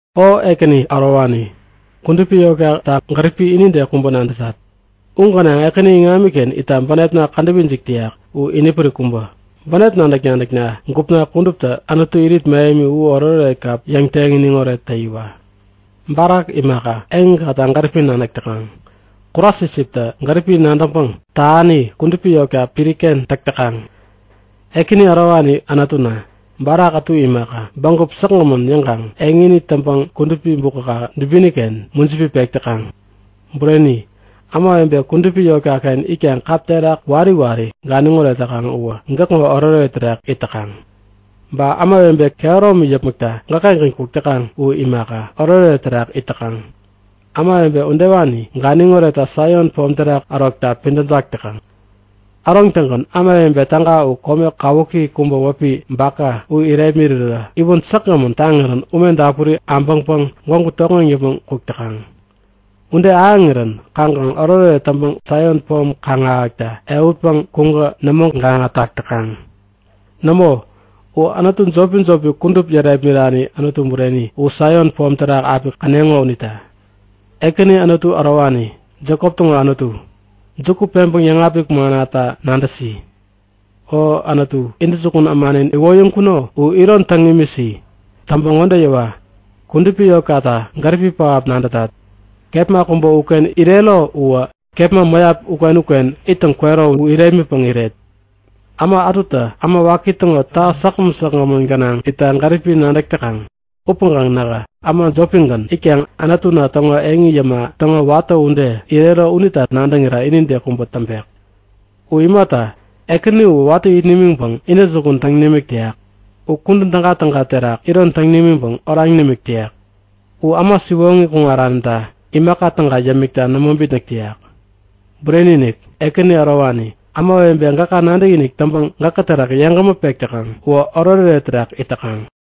O Ekäni ärowani, kudupi yotkata gäripi inide kubä nadätat! U gänaŋ Ekäni iŋamkaken itta bänepna kädäp ijik täyak u inipärik kubä. Bänep nadäk-nadäkna gupna kuduptä Anutu irit mähemi u oretoret kap yäŋteŋ iniŋoret täyiwa. Barak imaka, eŋikata gäripi nadäk täkaŋ. Kurasisiptä gäripi nadäŋpäŋ tähani kudupi yotka piriken täk täkaŋ. Ekäni ärowani Anutuna, barak ätu imaka, bägup säkgämän yäŋkaŋ eŋini täŋpäŋ kudupi bukäka dubiniken mujipi pek täkaŋ. Bureni, ämawebe kudupi yotkaken itkaŋ kap terak wari wari ganiŋoret täkaŋ uwä gäkŋo oretoret terak it täkaŋ. Ba ämawebe kehäromi yäpmäkta gäkkengän kuk täkaŋ u imaka, oretoret terak it täkaŋ. Ämawebe udewani ganiŋ oretta Saion pom terak ärokta pidämtak täkaŋ. Äroŋtäŋgän ämawebe täga u kome kawuki kubä wäpi Baka u irepmirirä iwän säkgämän taŋirän ume dapuri abäŋpäŋ gwägu tokŋeŋ yäpmäŋ kuk täkaŋ. Ude ahäŋirän kaŋkaŋ oretoret täŋpäŋ Saion pom kaŋ-ahäkta ehutpäŋ kuŋkä nämo gaŋatak täkaŋ. Nämo, u anutu jopi-jopi kudup yärepmirani Anutu bureni u Saion pom terak api käneŋo unita. Ekäni Anutu ärowani, Jekop täŋo Anutu, juku peŋpäŋ yäŋapik mannata nadäsi! O Anutu, intäjukun ämanin iwoyäŋkuno u iron täŋ imisi. Täŋpäŋ ŋode yäwa; Kudupi yotkata gäripi pähap nadätat. Kepma kubä uken irero uwä kepma mäyap uken-uken ittäŋ kwero u irepmitpäŋ iret. Äma ätutä äma waki täŋo täha säkgämän säkgämän gänaŋ itta gäripi nadäk täkaŋ upäŋkaŋ nähä äma jopigän itkaŋ Anutuna täŋo eŋi yäma täŋo watä ude irero unita nadäŋira inide kubä täŋpek. U imata, Ekäni uwä watä it nimiŋpäŋ intäjukun täŋ nimik täyak. U kudän tägatäga terak iron täŋ nimiŋpäŋ oraŋ nimik täyak. U äma siwoŋi kuŋaranita imaka täga yämikta nämo bitnäk täyak. Bureni-inik! Ekäni ärowani, ämawebe gäka nadäkinik täŋpäŋ gäkä terak yeŋgämä pek täkaŋ uwä oretoret terak it täkaŋ.